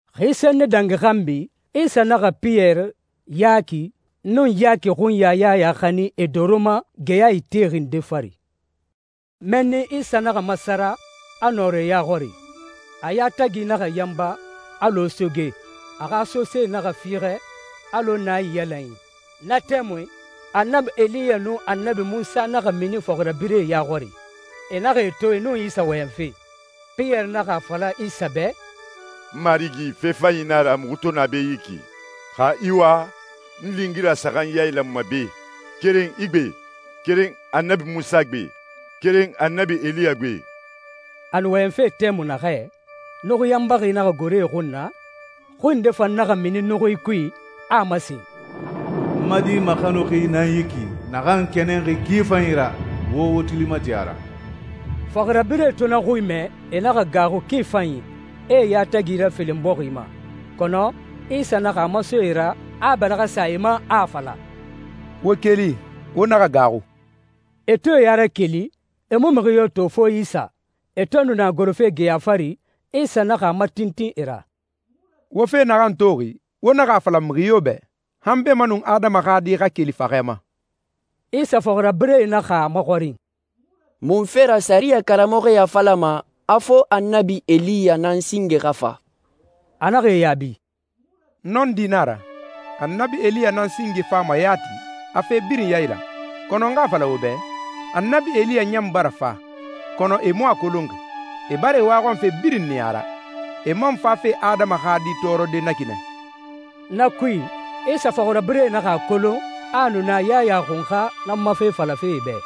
Xi senni dangi xanbi, Isa naxa Piyɛri, Yaki, nun Yaki xunya Yaya xanin e doro ma geya itexi nde fari. Mɛnni Isa naxa masara, a nɔrɔ e ya xɔri. A yatagi naxa yanba alɔ soge, a xa sosee naxa fiixɛ alɔ naiyalanyi. Na tɛmui, Annabi Eliya nun Annabi Munsa naxa mini fɔxirabirɛe ya xɔri, e naxa e to e nun Isa wɔyɛnfe. Piyɛri naxa a fala Isa bɛ, «Marigi, fe fanyi nan a ra muxu to na be yi ki. Xa i wa, n lingira saxan yailanma be, keren i gbe, keren Annabi Munsa gbe, keren Annabi Eliya gbe.» A nu wɔyɛnfe tɛmui naxɛ, nuxui yanbaxi naxa goro e xun na, xui nde fan naxa mini nuxui kui, a a masen, «N ma Di maxanuxi nan yi ki naxan n kɛnɛnxi ki fanyi ra. Wo wo tuli mati a ra.» Fɔxirabirɛe to na xui mɛ, e naxa gaaxu ki fanyi, e e yatagi rafelen bɔxi ma. Kɔnɔ Isa naxa a maso e ra, a a bɛlɛxɛ sa e ma, a a fala, «Wo keli. Wo naxa gaaxu.» E to e ya rakeli, e mu mixi yo to fo Isa. E to nu na gorofe geya fari, Isa naxa a matintin e ra, «Wo fe naxan toxi, wo naxa a fala mixi yo bɛ, han beemanun Adama xa Di xa keli faxɛ ma.» Isa fɔxirabirɛe naxa a maxɔrin, «Munfe ra sɛriyɛ karamɔxɔe a falama a fo Annabi Eliya nan singe xa fa?» A naxa e yaabi, «Nɔndi nan a ra. Annabi Eliya nan singe fama yati, a fe birin yailan. Kɔnɔ n xa a fala wo bɛ, Annabi Eliya ɲan bara fa, kɔnɔ e mu a kolonxi, e bara e waxɔnfe birin niya a ra. E man fafe Adama xa Di tɔɔrɔde na ki nɛ.» Na kui, Isa fɔxirabirɛe naxa a kolon a a nu na Yaya Xunxa nan ma fe falafe e bɛ.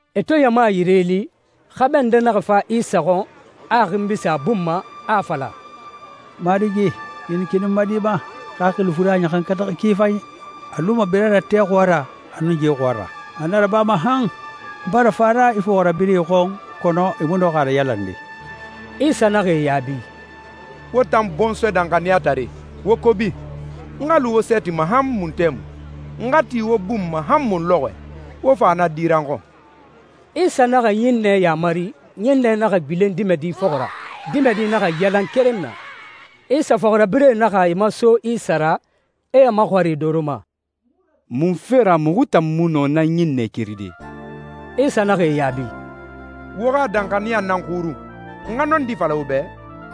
E to ɲama yire li, xɛmɛ nde naxa fa Isa xɔn, a a xinbi sin a bun ma, a a fala, «Marigi, kinikini n ma di ma, xaxili fure a ɲaxankataxi ki fanyi. A luma bira ra tɛ xɔɔra, a nun ye xɔɔra. A na rabama han. N bara fa a ra i fɔxirabirɛe xɔn, kɔnɔ e mu nɔxi a rayalande.» Isa naxa e yaabi, «Wo tan bɔnsɔɛ danxaniyatare, wo kobi! N xa lu wo sɛɛti ma han mun tɛmui? N xa ti wo bun ma han mun lɔxɔɛ? Wo fa na di ra n xɔn.» Isa naxa ɲinnɛ yamari, ɲinnɛ naxa gbilen dimɛdi fɔxɔ ra, dimɛdi naxa yalan keren na. Isa fɔxirabirɛe naxa e maso Isa ra, e a maxɔrin e doro ma, «Munfe ra muxu tan mu nɔ na ɲinnɛ keride?» Isa naxa e yaabi, «Wo xa danxaniya nan xurun. N xa nɔndi fala wo bɛ,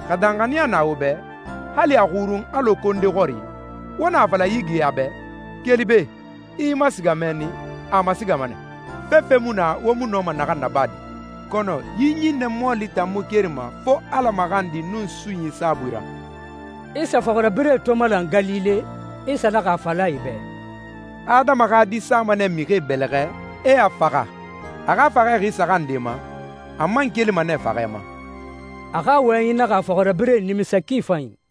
xa danxaniya na wo bɛ, hali a xurun alɔ konde xɔri, wo na a fala yi geya bɛ, ‹Keli be, i i masiga mɛnni,› a masigama nɛ. Fefe mu na wo mu nɔma naxan nabade. Kɔnɔ yi ɲinnɛ mɔɔli tan mu kerima fo Ala maxandi nun sunyi saabui ra.» Isa fɔxirabirɛe to malan Galile, Isa naxa a fala e bɛ, «Adama xa Di sama nɛ mixie bɛlɛxɛ, e a faxa. A xa faxɛ xi saxan nde ma, a man kelima nɛ faxɛ ma.» A xa wɔyɛnyi naxa a fɔxirabirɛe nimisa ki fanyi.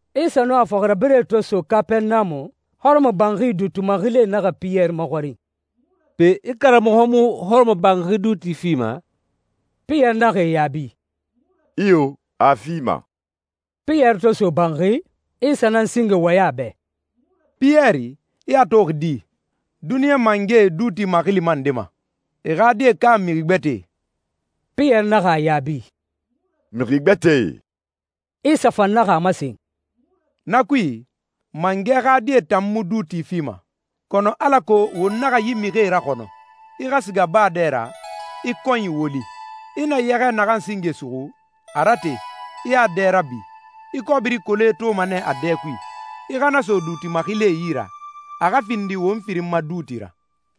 Isa nun a fɔxirabirɛe to so Kapɛrɛnamu, hɔrɔmɔbanxi duuti maxilie naxa Piyɛri maxɔrin, «Pe, i karamɔxɔ mu hɔrɔmɔbanxi duuti fima?» Piyɛri naxa e yaabi, «Iyo, a a fima.» Piyɛri to so banxi, Isa nan singe wɔyɛn a bɛ, «Piyɛri, i a toxi di? Duniɲa mangɛe duuti maxilima nde ma, e xa die ka mixi gbɛtɛe?» Piyɛri naxa a yaabi, «Mixi gbɛtɛe.» Isa fan naxa a masen, «Na kui, mangɛ xa die tan mu duuti fima. Kɔnɔ alako won naxa yi mixie raxɔnɔ, i xa siga baa dɛ ra, i kɔnyi woli. I na yɛxɛ naxan singe suxu, a rate, i a dɛ rabi. I kɔbiri kole toma nɛ a dɛ kui. I xa na so duuti maxilie yi ra, a xa findi won firin ma duuti ra.»